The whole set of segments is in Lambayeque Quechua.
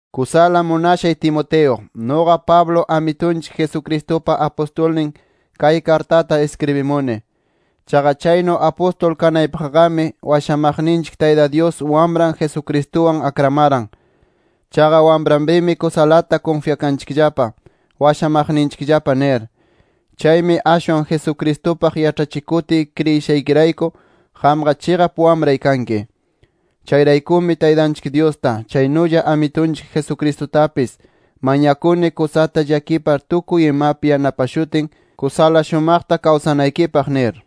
Kusala munashay Timoteo, nuqa Pablo Amitunchik Jesucristupa apustulninmi kay kartata iskribishuni. Chaqa chaynu apustul kanaypaqqami washamaqninchik Tayta Dyus Wamran Jesucristuwan akramaran. Chaqa Wamranpimi kusalata kunfyakanchikllapa washamaqninchikllapa nir. Chaymi ashwan Jesucristupaq yaĉhachikutiy kriyishaykirayku, qamqa chiqap wamray kanki. Chayraykumi Taytanchik Dyusta, chaynulla Amitunchik Jesucristutapis, mañakuni kusata llakipar tukuy imapi yanapashutin kusala shumaqta kawsanaykipaq nir.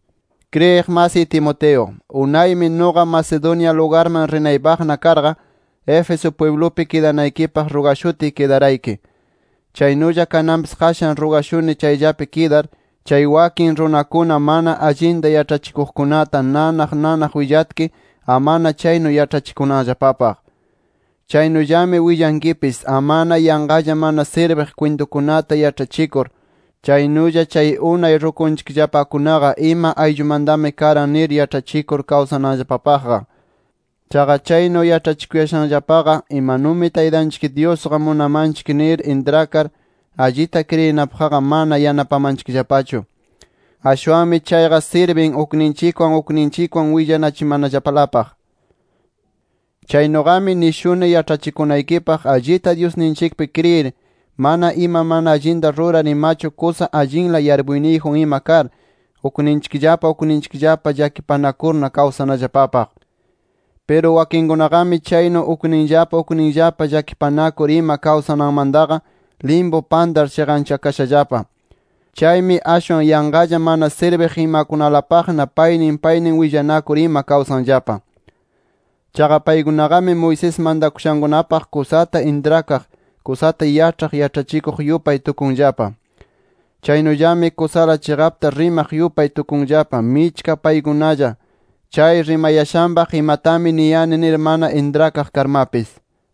Kriyiq masiy Timoteo, unaymi nuqa Macedonia lugarman rinaypaqna karqa, Éfeso pwiblupi kidanaykipaq rugashutiy kidarayki. Chaynulla kananpis qashan rugashuni chayllapi kidar, chay wakin runakuna mana allinta yaĉhachikuqkunata nanaq nanaq willatki, amana chaynu yaĉhachikunanllapapaq. Chaynullami willankipis amana yanqalla mana sirbiq kwintukunata yaĉhachikur, chaynulla chay unay rukunchikllapakunaqa ima ayllumantami karan nir yaĉhachikur kawsananllapapaqqa. Chaqa chaynu yaĉhachikuyashanllapaqa imanumi Taytanchik Dyusqa munamanchik nir intrakar, allita kriyinapaqqa mana yanapamanchikllapachu. Ashwanmi chayqa sirbin ukninchikwan ukninchikwan willanachimanallapalapaq. Chaynuqami nishuni yaĉhachikunaykipaq allita Dyusninchikpi kriyir, mana ima mana allinta rurar imachu kusa allinla yarpuyniyjun ima kar ukninchikllapa ukninchikllapa llakipanakurna kawsanallapapaq. Piru wakinkunaqami chaynu ukninllapa ukninllapa llakipanakur ima kawsananmantaqa limpu pantar chiqanchakashallapa. Chaymi ashwan yanqalla mana sirbiq imakunalapaqna paynin paynin willanakur ima kawsanllapa. Chaqa paykunaqami Moisés mantakushankunapaq kusata intrakaq, kusata yaĉhar yaĉhachikuq yupay tukunllapa. Chaynullami kusala chiqapta rimaq yupay tukunllapa, michka paykunalla chay rimayashanpaq imatami niyani nir mana intrakaq karmapis.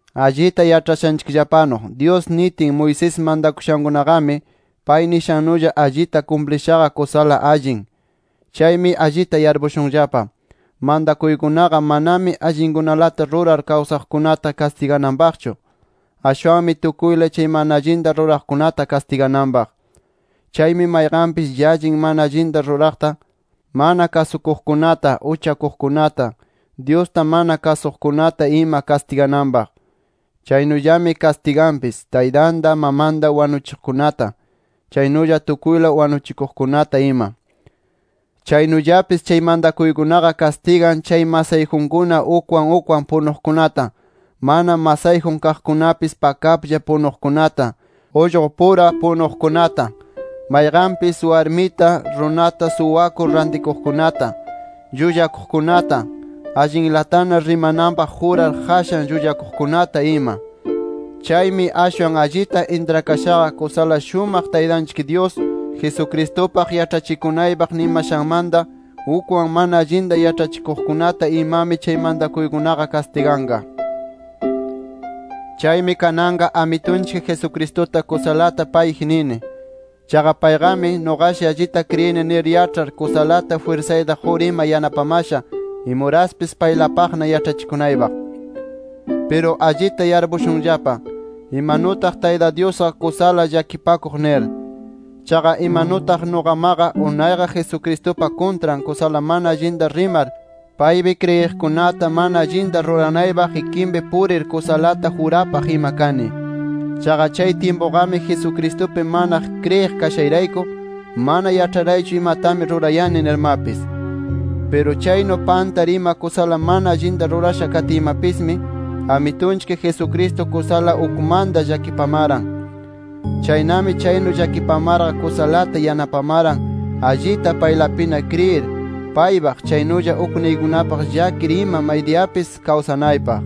Allita yaĉhashanchikllapanu Dyus nitin, Moisés mantakushankunaqami pay nishannulla allita kumplishaqa kusala allin. Chaymi allita yarpushunllapa: Mantakuykunaqa manami allinkunalata rurar kawsaqkunata kastigananpaqchu. Ashwanmi tukuyla chay mana allinta ruraqkunata kastigananpaq. Chaymi mayqanpis llallin mana allinta ruraqta, mana kasukuqkunata, uchakuqkunata, Dyusta mana kasuqkunata ima kastigananpaq. Chaynullami kastiganpis taytanta, mamanta wanuchiqkunata, chaynulla tukuyla wanuchikuqkunata ima. Chaynullapis chay mantakuykunaqa kastigan chay masayjunkuna ukwan ukwan punuqkunata, mana masayjun kaqkunapis pakaplla punuqkunata, ullqupura punuqkunata, mayqanpis warmita, runata suwakur rantikuqkunata, llullakuqkunata, allinlatana rimananpaq jurar qashan llullakuqkunata ima. Chaymi ashwan allita intrakashaqa, kusala shumaq Taytanchik Dyus, Jesucristupaq yaĉhachikunaypaq nimashanmanta, ukman mana allinta yaĉhachikuqkunata imami chay mantakuykunaqa kastiganqa. Chaymi kananqa Amitunchik Jesucristuta kusalata payji nini. Chaqa payqami, nuqaqashi allita kriyini nir yaĉhar kusalata jwirsayta qur ima yanapamasha imuraspis paylapaqna yaĉhachikunaypaq. Piru allita yarpushunllapa, imanutaq Tayta Dyusqa kusala llakipakuq nir. Chaqa imanutaq nuqamaqa unayqa Jesucristupa kuntran kusala mana allinta rimar, paypi kriyiqkunata mana allinta ruranaypaq ikinpi purir kusalata jurapaq ima kani. Chaqa chay tyimpuqami Jesucristupi mana kriyiq kashayrayku mana yaĉharaychu imatami rurayani nirmapis. Piru chaynu pantar ima kusala mana allinta rurasha katiymapismi, Amitunchik Jesucristo kusala ukmanta llakipamaran. Chaynami chaynu llakipamarqa kusalata yanapamaran allita paylapina kriyir, paypaq, chaynulla ukniykunapaq llakir ima maydiyapis kawsanaypaq.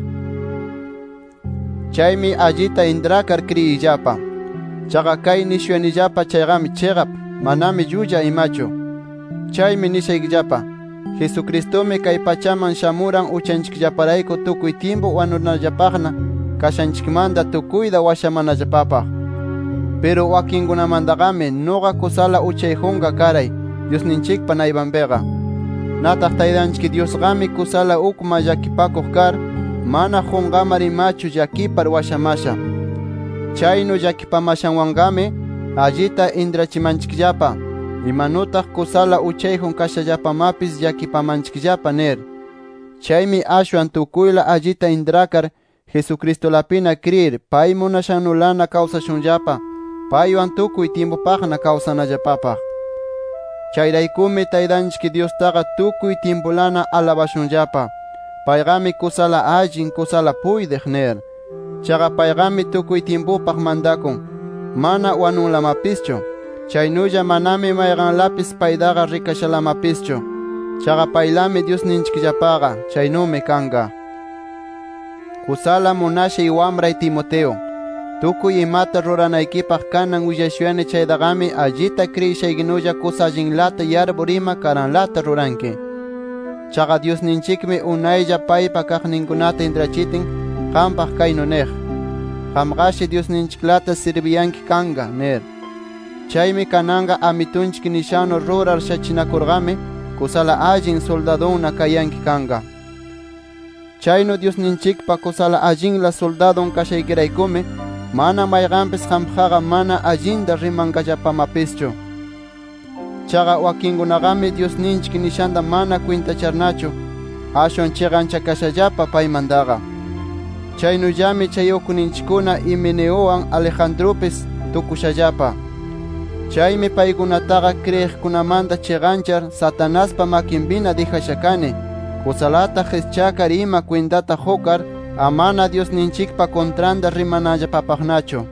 Chaymi allita intrakar kriyiyllapa. Chaqa kay nishuyanillapa chayqami chiqap, manami llulla imachu. Chaymi nishaykillapa: Jesucristumi kay pachaman shamuran uchanchikllaparayku tukuy tyimpu wanunallapapaqna kayashanchikmanta tukuyta washamanallapapaq. Piru wakinkunamantaqami, nuqa kusala uchayjunqa karay Dyusninchikpa naypanpiqa. Nataq Taytanchik Dyusqami kusala ukman llakipakuq kar, mana qunqamar imachu llakipar washamasha. Chaynu llakipamashanwanqami allita intrachimanchikllapa imanutaq kusala uchayjun kashallapamapis llakipamanchikllapa nir. Chaymi ashwan tukuyla allita intrakar Jesucristulapina kriyir, pay munashannulana kawsashunllapa, paywan tukuy tyimpupaqna kawsanallapapaq. Chayraykumi, Taytanchik Dyustaqa tukuy tyimpulana alabashunllapa: “Payqami kusala allin, kusala puytiq” nir. Chaqa payqami tukuy tyimpupaq mantakun, mana wanunlamapischu, chaynulla manami mayqanlapis paytaqa rikashalamapischu. Chaqa paylami Dyusninchikllapaqa. ¡Chaynumi kanqa! Kusala munashay wamray Timoteo, tukuy imata ruranaykipaq kanan willashuyani chaytaqami allita kriyishaykinulla, kusa allinlata yarpur ima karanlata ruranki. Chaqa Dyusninchikmi unaylla paypa kaqninkunata intrachitin qampaq kaynu niq: “Qamqashi Dyusninchiklata sirbiyanki kanqa” nir. Chaymi kananqa Amitunchik nishannu rurar shachinakurqami, kusala allin suldadunna kayanki kanqa. Chaynu Dyusninchikpa kusa allinla suldadun kashaykiraykumi mana mayqanpis qampaqqa mana allinta rimanqallapamapischu. Chaqa wakinkunamaqami Dyusninchik nishanta mana kwintacharnachu, ashwan chiqanchakashallapa paymantaqa. Chaynullami chay ukninchikkuna Himeneuwan, Alejandrupis tukushallapa. Chaymi paykunataqa kriyiqkunamanta chiqanchar, Satanaspa makinpina dijasha kani, kusalata qischakar ima kwintata qukar, amana Dyusninchikpa kuntranta rimananllapapaqnachu.